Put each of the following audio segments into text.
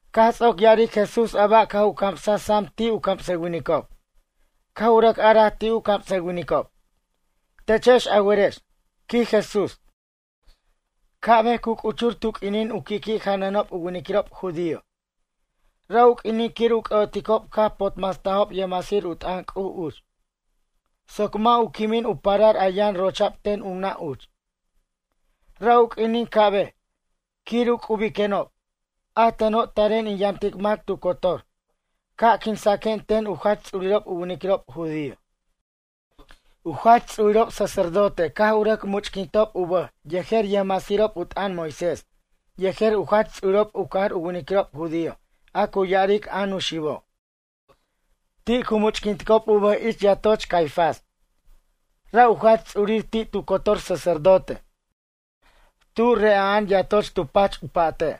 Caj ts'oc ya'aric Jesús a ba' caj u camsaj sam ti' u camsʌwinicob. Caj u rʌc araj ti' u camsʌwinicob: ―Techex a werex ―quij Jesús―. Ca'bej cu c'uchur tu q'uinin u qui'qui' janʌnob u winiquirob judío. Ra' u q'uinin quir u c'ʌ'oticob caj u potmastajob yʌjmasir u t'ʌn C'uj uch. Soc mʌ' u quimin u parar a yʌn rocha'b ten u nʌ' uch. Ra' u q'uinin ca'bej, quir u c'ubiquenob, a teno' taren in yamtic mac tu cotor, ca' quinsaquen ten u jach ts'urirob u winiquirob judío. U jach ts'urirob sacerdote caj u rʌc much'quintob u bʌj yejer yʌjcamsayʌjirob u t'ʌn Moisés yejer u jach ts'urirob u cajar u winiquirob judío a cu ya'aric a Nuxibo'. Ti' cu much'quinticob u bʌj ich yatoch Caifás. Ra' u jach ts'urir ti' tu cotor sacerdote, tu re'a'an yatoch tu pach u pa'te'.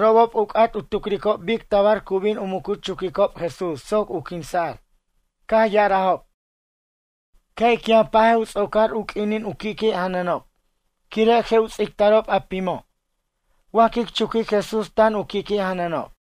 Robob u c'at u tucricob bic tabar cu bin u muc u chuquicob Jesús soc u quinsa'r. Caj ya'arajob: ―Ca' ic yʌn pajej u ts'ocar u q'uinin u qui'qui' janʌnob. Quire' je' u ts'ictarob a pimo' wa quic chuquic Jesús tan u qui'qui' janʌnob.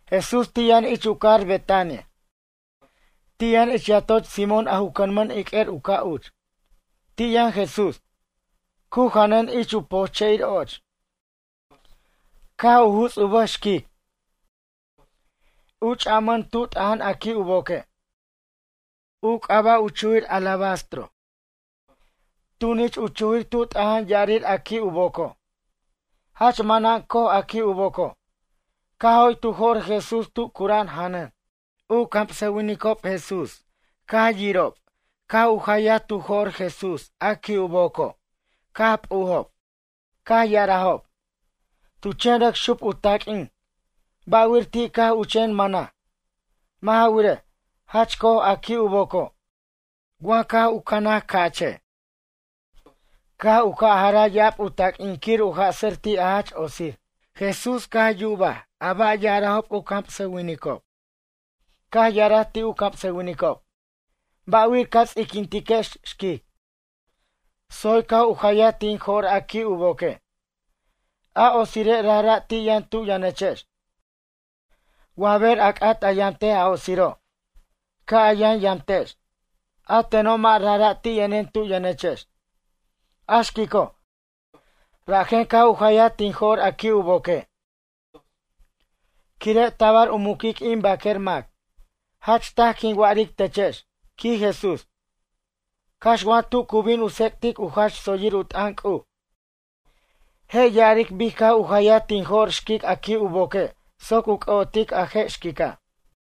Jesús ti' yʌn ich u cajar Betania. Ti' yʌn ich yatoch Simón a ju cʌnmʌn iq'uer u ca' uch. Ti' yʌn Jesús, cu janʌn ich u poche'ir och. Caj u juts u bʌj xquic. U ch'amʌn tu t'aja'an a qui' u boque'. U c'aba' u chujir, alabastro, tunich u chujir tu t'aja'an ya'arir a qui' u boco'. Jach manan coj a qui' u boco'. Caj joy tu jo'r Jesús tu cura'an janʌn. U camsʌwinicob Jesús caj yirob caj u jayaj tu jo'r Jesús a qui' u boco' caj p'ujob. Caj ya'arajob: ―Tu chen rʌc xup u taq'uin. Ba'wir ti' caj u chen mʌnaj? Mʌ' ja wirej, jach co'oj a qui' u boco'. Wa caj cʌnaj ca'che', caj u ca' jaraj ya'ab u taq'uin quir u jasʌr ti' a jach otsir. Jesús caj yuba ba' ya'arajob u camsʌwinicob. Caj ya'araj ti' u camsʌwinicob: ―Ba'wir ca ts'iquintiquex xquic. Tsoy caj u jayaj tin jo'r a qui' u boque'. A otsire' rajra' ti' yʌn tu yʌnechex. Wa ber a c'at a yamtej a otsiro', ca' a yʌn yamtex. A teno' mʌ' rajra' ti' yʌnen tu yʌnechex. A xquico', rajen caj u jayaj tin jo'r a qui' u boque'. Quire' tabar u muquic in baquer mac. Jach taj quin wa'aric techex ―quij Jesús―. Cax wa tu cu bin u tsec'tic u jach tsoyir u t'ʌn C'uj. Je' ya'aric bic caj u jayaj tin jo'r xquic a qui' u boque' soc u c'ʌ'otic a je' xquica'.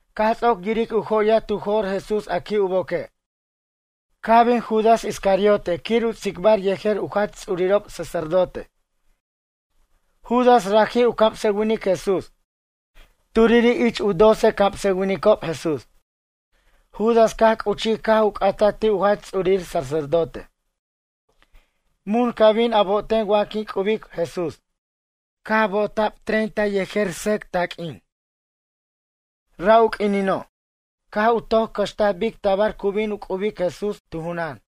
Caj ts'oc yiric u joyaj tu jo'r Jesús a qui' u boque'. Caj bin Judas Iscariote quir u tsicbar yejer u jach ts'urirob sacerdote. Judas raji' u camsʌwinic Jesús. Turiri' ich u doce camsʌwinicob Jesús. Judas caj c'uchij caj u c'ataj ti' u jach ts'urir sacerdote: ―Mun ca bin a bo'oten wa quin c'ubic Jesús? Caj bo'ota'b yejer sʌc taq'uin treinta. Ra' u q'uinino', caj u toc cʌxtaj bic tabar cu bin u c'ubic Jesús tu junan.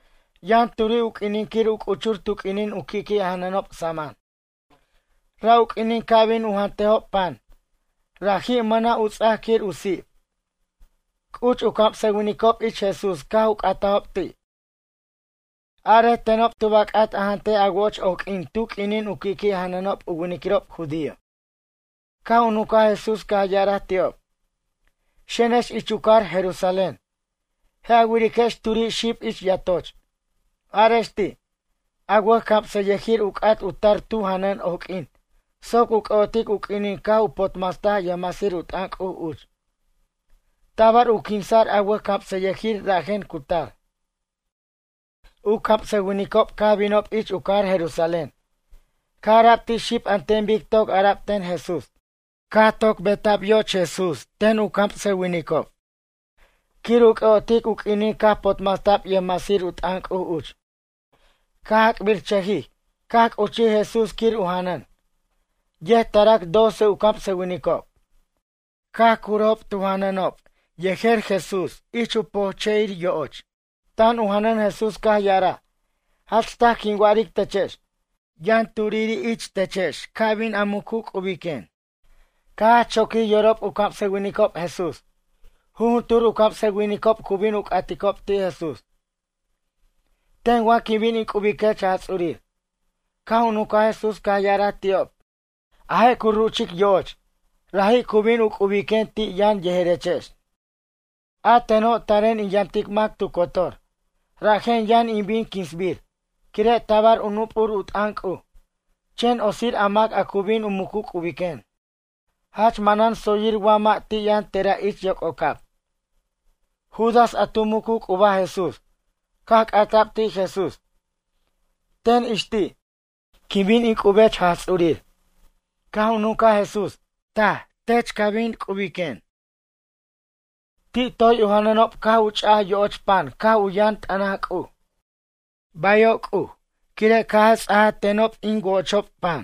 Yʌn turi' u q'uinin quir u c'uchur tu q'uinin u qui'qui' janʌnob saman. Ra' u q'uinin ca' bin u jantejob pan, raji' mʌna' u ts'ac quir u sip. C'uch u camsʌwinicob ich Jesús caj u c'atajob ti': ―Arej tenob tub a c'at a jantej a wo'och oq'uin tu q'uinin u qui'qui' janʌnob u winiquirob judío? Caj u nuncaj Jesús caj ya'araj ti'ob: ―Xenex ich u cajar Jerusalén. Je' a wiriquex turi' xib ich yatoch. Arex ti': “A wʌjcamsʌyʌjir u c'at u tar tu janʌn oq'uin soc u c'ʌ'otic u q'uinin caj u potmastaj yʌjmasir u t'ʌn C'uj uch. Tabar u quinsa'r a wʌjcamsʌyʌjir rajen cu tar.” U camsʌwinicob caj binob ich u cajar Jerusalén. Caj ara'b ti' xib an ten bic toc ara'b ten Jesús. Caj toc bota'b yo'och Jesús ten u camsʌwinicob quir u c'ʌ'otic u q'uinin caj potmasta'b yʌjmasir u t'ʌn C'uj uch. Caj ac'birchʌjij, caj c'uchij Jesús quir u janʌn. Yet tarac doce u camsʌwinicob. Caj curob tu janʌnob yejer Jesús ich pojche'ir yo'och. Tan tu janʌn Jesús caj ya'araj: ―Jach taj quin wa'aric techex. Yʌn turiri' techex ca bin a mucu c'ubiquen. Caj jach choquij yorob u camsʌwinicob Jesús. Jujuntur u camsʌwinicob cu bin u c'aticob ti' Jesús: ―Ten wa quin bin in c'ubiquech Jaj Ts'urir? Caj u nuncaj Jesús caj ya'araj ti'ob: ―A je' cu ruchic yo'och, raji' cu bin u c'ubiquen ti' yʌn yejerechex. A teno' taren in yamtic mac tu cotor. Rajen yʌn in bin quinsbir, quire' tabar u nup'ur u t'ʌn C'uj. Chen otsir a mac a cu bin u mucu c'ubiquen. Jach manan tsoyir wa mʌ' ti' yʌn tera' ich yoc'ocab. Judas a tu mucu c'ubaj Jesús. Caj cata'b ti' Jesús: ―Ten ix ti', quin bin in c'ubiquech Jaj Ts'urir? Caj u nuncaj Jesús: ―Taj, tech ca bin c'ubiquen. Ti' toy u janʌnob caj u ch'aj yo'och pan caj u yʌn t'ʌnaj C'uj: ―Bayo' C'uj, quire' caj a ts'aj tenob in co'ochob pan.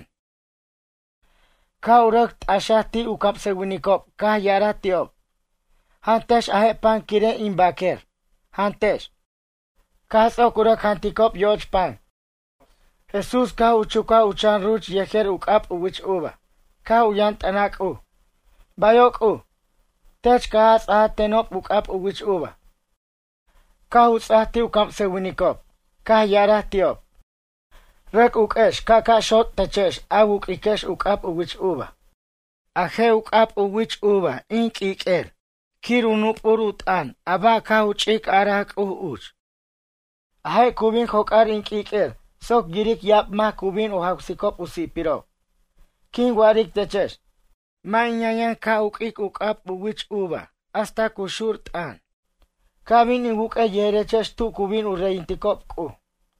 Caj u rʌc t'axaj ti' u camsʌwinicob caj ya'araj ti'ob: ―Jantex a je' pan quire' in bʌq'uer. Jantex. Caj ts'oc u rʌc janticob yo'och pan. Jesús caj u chucaj u chan ruch yejer u c'ab u wich uva. Caj u yʌn t'ʌnaj C'uj: ―Bayo' C'uj, tech caj a ts'aj tenob u c'ab u wich uva. Caj u ts'aj ti' u camsʌwinicob. Caj ya'araj ti'ob: ―Rʌc uq'uex ca'ca' xot' techex a wu'quiquex u c'ab u wich uva. A je' u c'ab u wich uva in q'uiq'uer quir u nup'ur u t'ʌn a ba' caj u ch'ic araj C'uj uch. A je' cu bin joc'ar in q'uiq'uer soc yiric ya'ab mac cu bin u jawsicob u si'pirob. Quin wa'aric techex. Mʌ' in yʌnyʌn ca' uq'uic u c'ab u wich uva hasta cu xur t'ʌn. Ca' bin in wuq'uej yejerechex tu cu bin u reyinticob C'uj.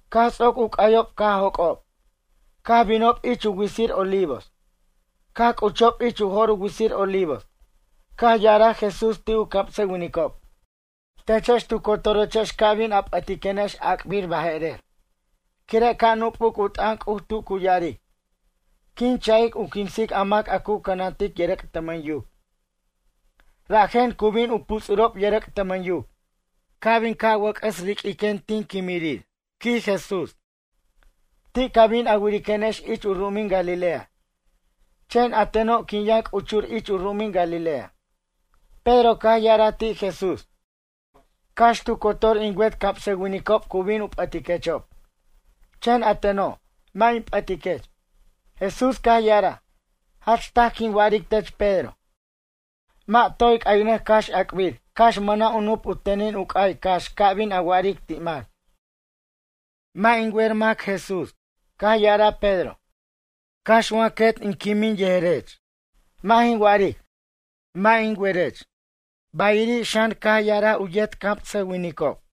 Caj ts'oc u c'ayob caj joc'ob, caj binob ich u witsir Olivos. Caj c'uchob ich u jo'r u witsir Olivos. Caj ya'araj Jesús ti' u camsʌwinicob: ―Techex tu cotorechex ca bin a p'ʌtiquenex ac'bir baje'rer, quire' ca' nup'uc u t'ʌn C'uj tu cu ya'aric: “Quin cha'ic u quinsic a mac a cu cʌnantic yʌrʌc' tʌmʌn yuc. Rajen cu bin u puts'urob yʌrʌc' tʌmʌn yuc.” Ca' bin in wʌc'ʌs riq'uir tin quimirir ―quij Jesús―, ti' ca bin a wiriquenex ich u ru'umin Galilea. Chen a teno' quin yʌn c'uchur ich u ru'umin Galilea. Pedro caj ya'araj ti' Jesús: ―Cax tu cotor in wet camsʌwinicob cu bin u p'ʌtiquechob. Chen a teno', mʌ' in p'ʌtiquech. Jesús caj ya'araj: ―Jach taj quin wa'aric tech Pedro. Mʌ' toy c'aynʌc cax ac'bir cax mʌna' u nup u tenin u c'ay cax ca bin a wa'aric ti' mac: “Mʌ' jin wer mac Jesús.” Caj ya'araj Pedro: ―Cax wa in quet quimin yejerech. Mʌ' jin wa'aric, mʌ' jin werech. Bayiri' xan, caj ya'araj u yet camsʌwinicob.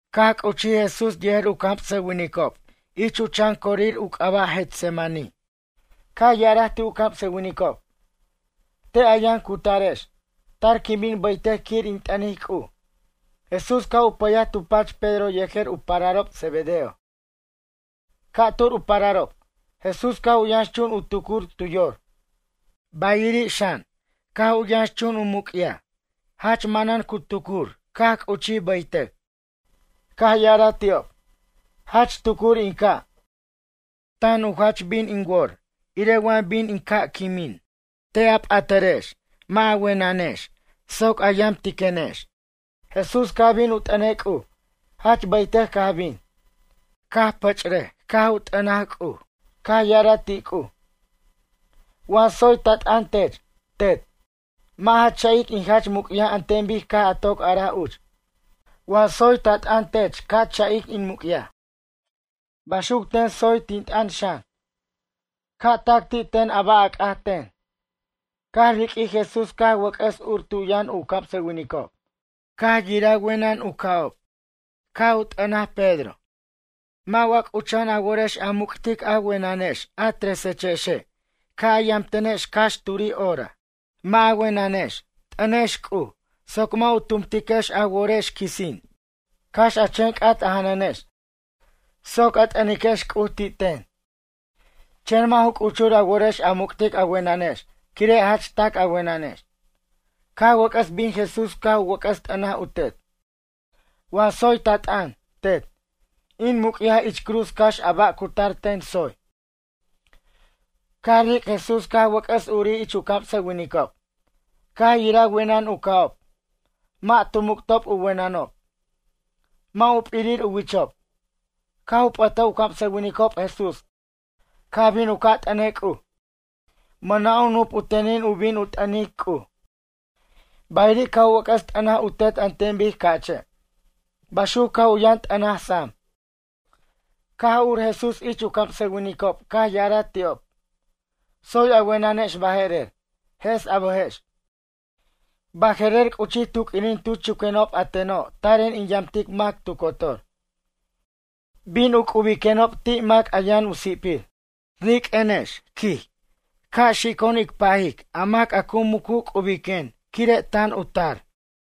Caj c'uchij Jesús yejer u camsʌwinicob ich u chan corir u c'aba' Getsemaní. Caj ya'araj ti' u camsʌwinicob: ―Te' a yʌn cutarex. Tar quin bin bʌytʌc quir in t'ʌnic C'uj. Jesús caj u pʌyaj tu pach Pedro yejer u pararob Zebedeo. Ca'tur u pararob. Jesús caj u yʌnxchun u tucur tu yor, bayiri' xan, caj u yʌnxchun u muc'yaj. Jach manan cu tucur caj c'uchij bʌytʌc. Caj ya'araj ti'ob: ―Jach tucur in ca'. Tan u jach bin in wor irej wa bin in ca' quimin. Te' a p'atʌrex mʌ' ja wenʌnex soc a yamtiquenex. Jesús caj bin u t'ʌnej C'uj. Jach bʌytʌc caj bin. Caj pʌch'raj caj u t'ʌnej C'uj. Caj ya'araj ti' C'uj: ―Wa tsoy ta t'ʌn tech, Tet. Mʌ' ja cha'ic in jach muc'yaj an ten bic caj a toc araj uch. Wa tsoy ta t'ʌn tech ca cha'ic in muc'yaj. Baxuc ten tsoy tin t'ʌn xan, ca' tac ti' ten a ba' a c'at ten. Caj riq'uij Jesús caj wʌc'ʌs ur tu yʌn u camsʌwinicob. Caj yiraj wenʌn u ca'ob. Caj u t'ʌnaj Pedro: ―Mʌ' wa c'ucha'an a worex a muc'tic a wenex a tresechexe' ca' a yamtenex cax turi' hora? Mʌ' ja wenʌnex, t'ʌnex C'uj soc mʌ' u tumtiquex a worex quisin. Cax a chen c'at aja'anechex soc a t'ʌniquechex C'uj ti' ten. Chen mʌ' ju c'uchur a worex a muc'tic a wenʌnex quire' jach tac a wenʌnex. Caj wʌc'ʌs bin Jesús caj u wʌc'ʌs t'ʌnaj u Tet: ―Wa tsoy ta t'ʌn, Tet, in muc'yaj ich cruz cax a ba' cu tar ten, tsoy. Caj ric' Jesús caj wʌc'ʌs urij ich u camsʌwinicob. Caj yiraj wenʌn u ca'ob. Mʌ' tu muc'tob u wenʌnob. Mʌ' u p'irir u wichob. Caj u p'ʌtaj u camsʌwinicob Jesús caj bin u ca' t'ʌnej C'uj. Mʌna' u nup u tenin u bin u t'ʌnic C'uj. Bayiri' caj u wʌc'ʌs t'ʌnaj u Tet an ten bic ca'che'. Baxuc caj u yʌn t'ʌnaj sam. Caj ur Jesús ich u camsʌwinicob caj ya'araj ti'ob: ―Tsoy a wenʌnex baje'rer, jes a bʌjex. Baje'rer c'uchij tu q'uinin tu chuquenob a teno' taren in yamtic mac tu cotor. Bin u c'ubiquenob ti' mac a yʌn u si'pir. Riq'uenex ―quij―, ca' xico'on ic pajic a mac a mucu c'ubiquen quire' tan u tar.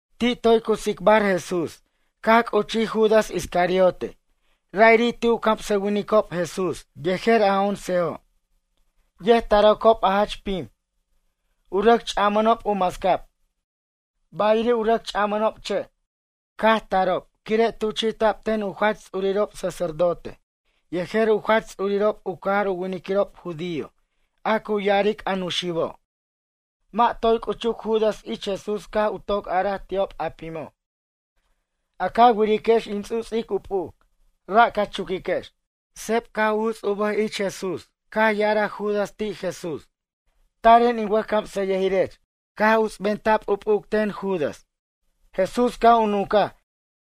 Ti' toy cu tsicbar Jesús caj c'uchij Judas Iscariote ra'iri' ti' u camsʌwinicob Jesús yejer a oncejo'. Yet taracob a jach pim. U rʌc ch'amʌnob u mascab, bayiri' u rʌc ch'amʌnob che', caj tarob quire' tuchi'ta'b ten u jach tsuririrob sacerdote yejer u jach ts'urirob u cajar u winiquirob judío a cu ya'aric a Nuxibo'. Mʌ' toy c'uchuc Judas ich Jesús caj u toc araj ti'ob a pimo': ―A ca wiriquex in ts'u'ts'ic u p'uc. Ra' ca chuquiquex. Seb caj u juts u bʌj ich Jesús caj ya'araj Judas ti' Jesús: ―Taren in wʌjcamsʌyʌjirech. Caj uts'benta'b u p'uc ten Judas. Jesús caj u nuncaj: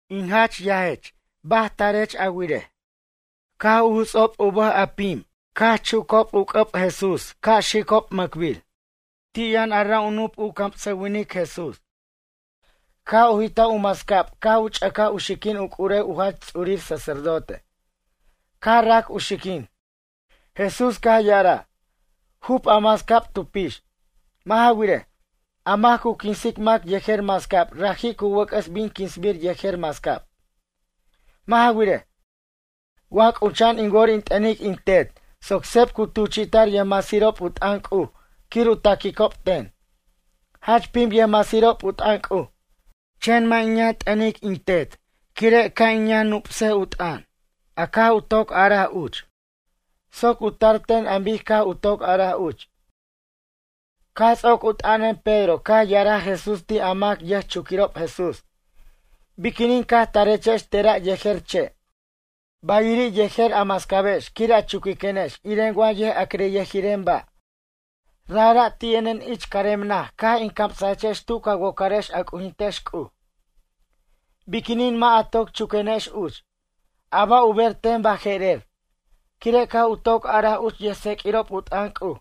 ―In yajech baj tarech a wirej? Caj u juts'ob u bʌj a pim caj chucob u c'ʌb Jesús ca' xicob mʌcbir. Ti' yʌn ra' u camsʌwinic Jesús u nup. Caj u jit'aj u mascab caj u ch'ʌcaj u xiquin u c'urew u jach ts'urir sacerdote. Caj rac u xiquin. Jesús caj ya'araj: ―Jup a mascab tu pix. Mʌ' ja wirej, a mac cu quinsic mac yejer mascab raji' cu wʌc'ʌs bin quinsa'r yejer mascab. Mʌ' ja wirej, wa c'ucha'an in wor in t'ʌnic in Tet soc seb cu tuchi'ta'r yʌjmasirob u t'ʌn C'uj quir u taquicob ten. Jach pim yʌjmasirob u t'ʌn C'uj. Chen mʌ' in t'ʌnic in Tet quire' ca' u yʌn nup'ur u t'ʌn, a caj u toc araj uch, soc u tar ten an bic caj u toc araj uch. Caj ts'oc u t'ʌnan Pedro caj ya'araj Jesús ti' a mac yʌjchuquirob Jesús: ―Biquinin caj tarechex tera' yejer che', bayiri' yejer a mascabex quir a chuquiquenex iren wa yʌjac'ricyʌjiren ba'. Rajra' ti' yʌnen ich carem naj caj in camsechex tu ca wocarex a c'ujintex C'uj. Biquinin mʌ' a toc chuquenex uch? A ba' u ber ten baje'rer, quire' caj u toc araj uch yʌjtseq'uirob u t'ʌn C'uj.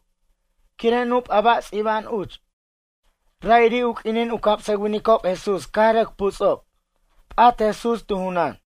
Quire' nup' a ba' ts'iba'an uch. Ra'iri' u q'uinin u camsʌwinicob Jesús caj rʌc puts'ob. P'at Jesús tu junan.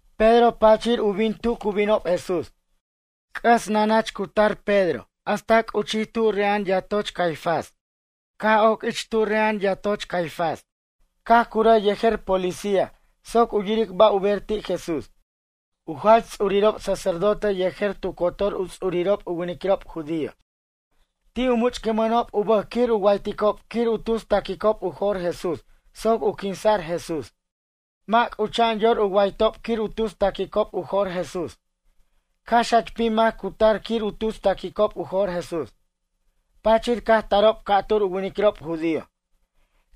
Pedro pachir u bin tu cu binob Jesús. C'ʌs nanach cu tar Pedro hasta c'uchij tu re'a'an yatoch Caifás. Caj oc ich tu re'a'an yatoch Caifás. Caj curaj yejer policía soc u yiric ba' u ber ti' Jesús. U jach ts'urirob sacerdote yejer tu cotor u ts'urirob u winiquirob judío. Ti' u much'quinmʌnob u bʌj quir u wayticob quir u tus ta'quicob u jo'r Jesús soc u quinsa'r Jesús. Mʌ' c'ucha'an yor u waytob quir u tus ta'quicob u jo'r Jesús. Cax jach pim mac cu tar quir u tus ta'quicob u jo'r Jesús. Pachir caj tarob ca'tur u winiquirob judío.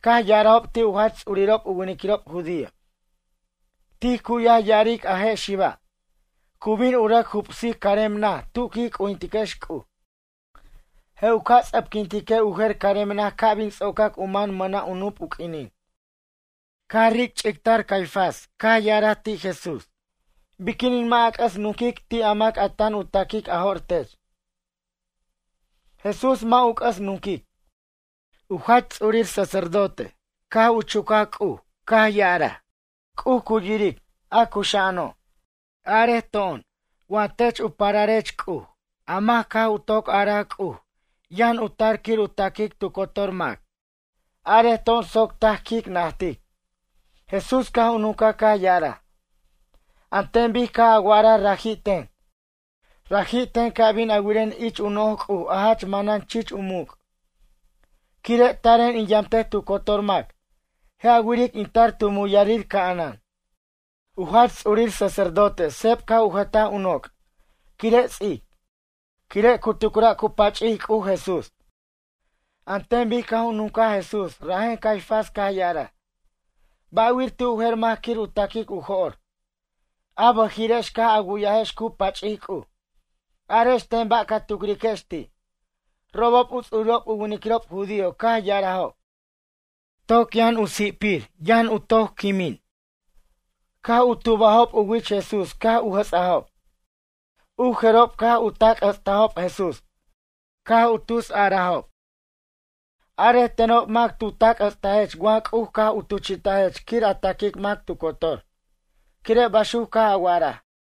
Caj ya'arajob ti' u jach ts'urirob u winiquirob judío: ―Tij cu'yaj ya'aric a je' xiba', cu bin u rʌc jubsic carem naj tu quij c'ujintiquex C'uj. Je' u ca' ts'ʌpquintique' u jer carem naj ca' bin ts'ocac u man mʌna' u nup u q'uinin. Caj ric' u ch'ictar Caifás caj ya'araj ti' Jesús: ―Biquinin mʌ' a c'ʌs nunquic ti' a mac tan u ta'quic a jo'r tech? Jesús mʌ' u c'ʌs nunquic. U jach ts'urir sacerdote caj u chuchaj C'uj caj ya'araj: ―C'uj cu yiric, a cuxa'ano'. Arej to'on wa tech u pararech C'uj a mac caj u toc araj C'uj yʌn u tar quir u ta'quic tu cotor mac? Arej to'on soc taj quic najtic. Jesús caj u nuncaj caj ya'araj: ―An ten bic caj a wa'araj raji' ten. Raji' ten ca bin a wiren ich u noj C'uj a jach manan chich u muc'. Quire' taren in yamtej tu cotor mac. Je' a wiric in tar tu muyarir ca'anan. U jach ts'urir sacerdote seb caj u jʌtaj u noc' quire' ts'ic. Quire' cu tucra' cu pach'ic C'uj Jesús, an ten bic caj u nuncaj Jesús rajen Caifás caj ya'araj: ―Ba'wir ti' u jer mac quir u ta'quic u jo'r? A bʌjirex caj a wu'yajex cu pach'ic C'uj. Arex ten ba' ca tucriquex ti'? Robob u ts'urirob u winiquirob judío caj ya'arajob: ―Toc yʌn u si'pir ca' u yʌn u quimin. Caj u tubajob u wich Jesús caj u jʌts'ajob. U jerob caj u tac' jʌts'tajob Jesús. Caj u tus ya'arajob: ―Arej tenob mac tu tac' jʌts'tajech wa C'uj caj u tuchi'tajech quir a ta'quic mac tu cotor, quire' baxuc caj a wa'araj.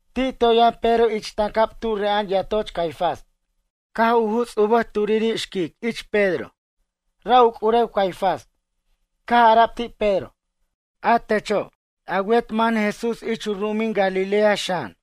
Ti' toy yʌn Pedro ich tancab tu re'a'an yatoch Caifás. Caj u juts' u bʌj turiri' xquic ich Pedro. Ra' u c'urew Caifás. Caj ara'b ti' Pedro: ―A techo' ―quij ya'araj―, a wet man Jesús ich u ru'umin Galilea xan.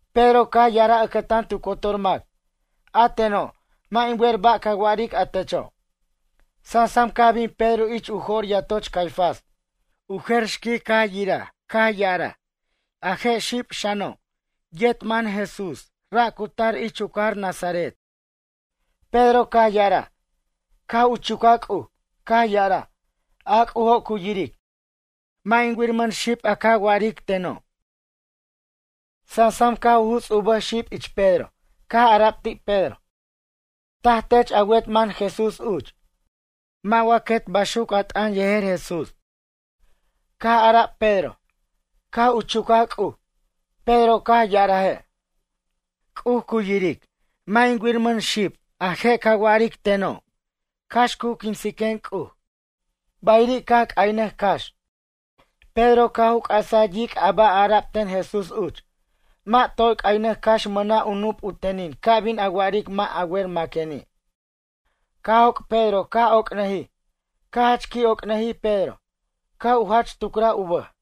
Pedro caj ya'araj ʌcʌtan tu cotor mac: ―A teno', mʌ' in wer ba' ca wa'aric a techo'. Sansam caj bin Pedro ich u jor yatoch Caifás. U jer xquic caj yiraj caj ya'araj: ―A je' xiba' xano', yet man Jesús ra' cu tar ich u cajar Nazaret. Pedro caj ya'araj, caj u chucaj C'uj, caj ya'araj: ―A C'ujo' cu yiric. Mʌ' jin wiramʌn xib a ca c'atic teno'. Sansam caj u juts' u bʌj xib ich Pedro caj ara'b ti' Pedro: ―Taj tech a wet mʌn Jesús uch. A mʌ' quet baxuc a t'ʌn yejer Jesús. Caj ara'b Pedro, caj u chucaj C'uj, Pedro caj ya'araje': ―C'uj cu yiric, mʌ' in wiramʌn xib a je' ca wa'aric teno'. Cax cu quinsiquen C'uj. Bayiri' caj c'aynʌj cax. Pedro caj u c'asaj yic' a ba' ara'b ten Jesús uch: “Mʌ' toy c'aynʌc cax mʌna' u nup u tenin ca bin a wa'aric mʌ' a wer maqueni'.” Caj joc' Pedro caj oc'nʌjij. Caj jach qui' oc'nʌjij Pedro, caj u jach tucraj u bʌj.